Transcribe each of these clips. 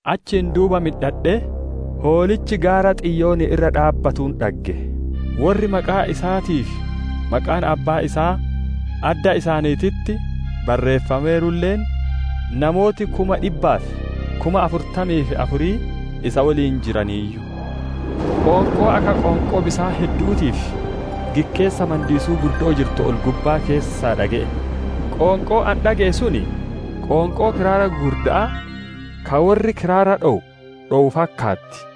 Achiin duuba midhadhee, Hoolichi gaara Xiyoonii irra dhaabbatuun dhagge; worri maqaan isaatii fi maqaan Abbaa isaa adda isaaniititti barreeffameerulle, namooti kuma dhibbaa fi kuma afurtamii fi afur isa woliin jiraniiyyu. Qoonqoo akka qoonqoo bisaan heddu'uutii fi gikkeessa mandiisuu guddo'oo jirtu ol-gubbaa keessaa dhage'e; qoonqoon ani dhage'e sun qoonqoo kiraara gugurda'aa ka worri kiraara dhowu dhowuu fakkaatti.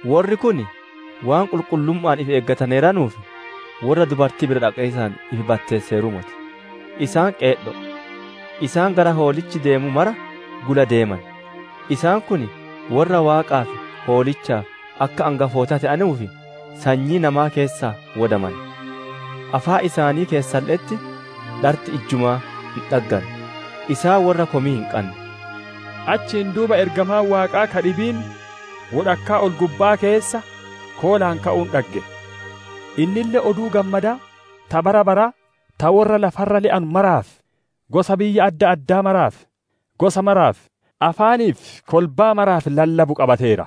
Worri kun waan qulqullumma'aan ifi eegataneeranuuf, worra dubartii bira dhaqiisaan ifi batteesseeruu moti; isaan qeedho'o. Isaan gara Hoolichi deemu mara gula deeman; isaan kun worra Waaqaa fi Hoolichaaf akka angafoota te'anuuf, sanyii namaa keessaa wodamane. Afaan isaanii keessalle'etti dharti ijjumaa hin dhagganne; isaan worra komii hin qanne. Achiin duuba ergamaan Waaqaa ka dhibiin wodhakkaa ol-gubba'aa keessa koolaan ka'uun dhagge; innille Oduu Gammadaa ta bara baraa, ta worra lafa irra le'u maraaf, gosa biyya adda addaa maraaf, gosa maraaf, afaanii fi kolbaa maraaf lallabu qabateera.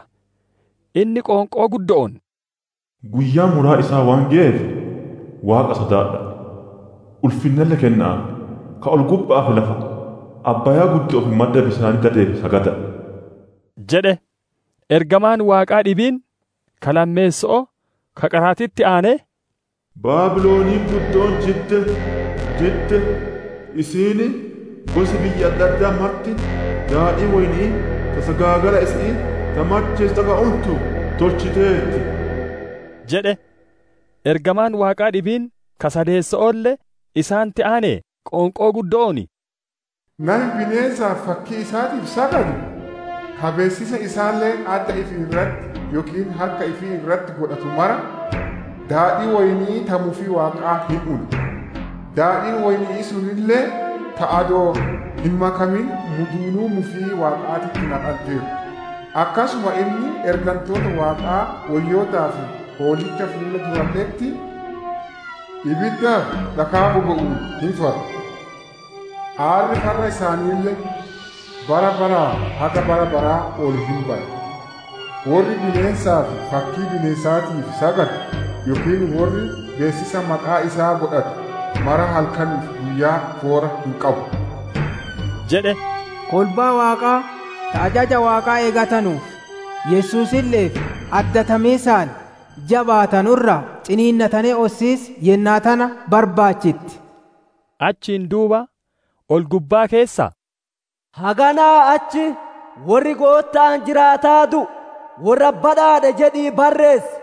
Inni qoonqoo guddo'oon, «Guyyaan muraa isaa waan geyeef, Waaqa sodaadha'a, ulfinnalle kenna'aaf! Ka ol-gubba'aa fi lafa, abbaaya'aa fi madda bisaanii dadeef sagada'a!» jedhe. Ergamaan Waaqaa dhibiin, ka lammeesso'oo, ka qaraatitti aanee, «Baabiloniin guddoon jidde! Jidde! Isiin gosi biyya adda addaa marti, daadhii woyni'ii ta sagaagala isi'ii, ta macheessitu akka untu tolchiteerti» jedhe. Ergamaan Waaqaa dhibiin, ka sadeesso'oolle, isaanitti aanee qoonqoo guddo'oon, «Nami bineensaa fi fakkii isaatiif sagadu, ka beessisa isaalle adda ifii irratti yookiin harka ifii irratti godhatu mara, daadhii woyni'ii ta mufii Waaqaa hin una; daadhiin woyni'ii sunille ta adoo hin makamin muduunuu mufii Waaqaatitti naqanteertu; akkasuma inni ergantoota Waaqaa woyyootaa fi Hoolicha fuula duralle'etti ibiddaa fi dhakaa bobe'uun hin farra. Aarri farra isaaniille bara baraa haga bara baraa ol hin baya; worri bineensaa fi fakkii bineensaatiif sagadu, yookiin worri beessisa maqaa isaa godhatu mara halkanii fi guyyaa foora hin qabu» jedhe. Kolbaa Waaqaa ta ajaja Waaqaa eeggatanuu fi Yesuusille'eef addatamiisaan jabaatanu irraa ciniinnatanee ossiis yennaa tana barbaachitti. Achiin duuba ol-gubbaa keessaa, «Haganaa achi worri Gootta'aan jiraataa du'u, worra badhaadhe jedhii barreessi»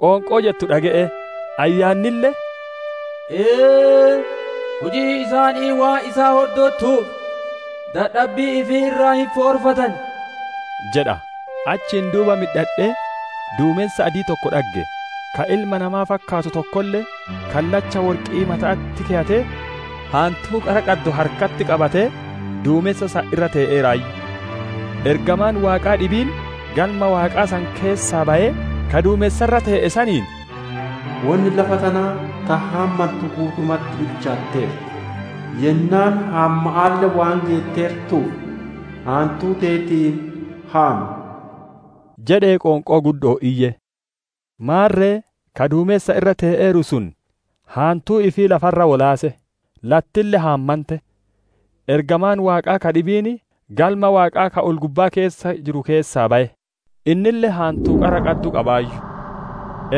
qoonqoo jettu dhage'e. Ayyaannille, «Ee, hujiin isaanii waan isaan hordottuuf, dadhabbii ifii irraa hin foorfatan» jedha. Achiin duuba midhadhee, duumensa adii tokko dhagge; ka ilma namaa fakkaatu tokkolle, kallacha worqi'ii mata'atti keyatee, haantuu qara qaddu harkatti qabatee, duumensa san irra te'eeraayyu. Ergamaan Waaqaa dhibiin, Galma Waaqaa san keessaa bayee, ka duumensa irra tee'e saniin, «Wonni lafa tanaa ta haammantu guutumatti bilchaateerti; yennaan haamma'aalle waan geetteertuuf, haantuu teetiin haam!» jedhee qoonqoo guddo'oon iyye. Maarre, ka duumensa irra tee'eeru sun haantuu ifii lafa irra wolaase; lattille haamante. Ergamaan Waaqaa ka dhibiin, Galma Waaqaa ka ol-gubbaa keessa jiru keessaa baye; innille haantuu qara qaddu qabaayyu.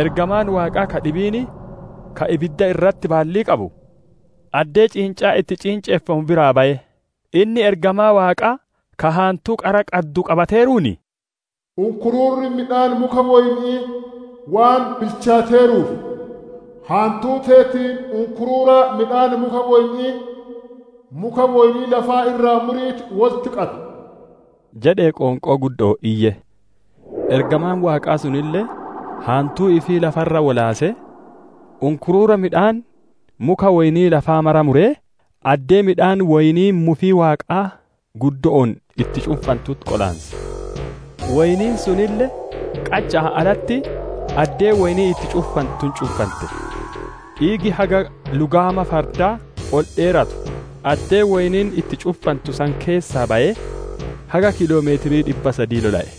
Ergamaan Waaqaa ka dhibiin, ka ibidda irratti baallii qabu, addee ciincaan itti ciinceffamu biraa baye; inni ergamaa Waaqaa ka haantuu qara qaddu qabateeruun, «Unkuruurri midhaan muka woyni'ii waan bilchaateeruuf, haantuu teetiin unkuruura midhaan muka woyni'ii, muka woynii lafa irraa muriitii wolitti qabi» jedhee qoonqoo guddo'oon iyye. Ergamaan Waaqaa sunille, haantuu ifii lafa irra wolaasee, unkuruura midhaan muka woynii lafaa mara muree, addee midhaan woynii mufii Waaqaa guddo'oon itti cunfantutti qolaanse. Woyniin sunille qacha'aan alatti addee woyniin itti cunfantutti cunfante; dhiigi haga lugaama fardaa ol dheeratuu addee woyniin itti cunfantu san keessaa bayee, haga kiiloo meetira dhibba sadii lola'e.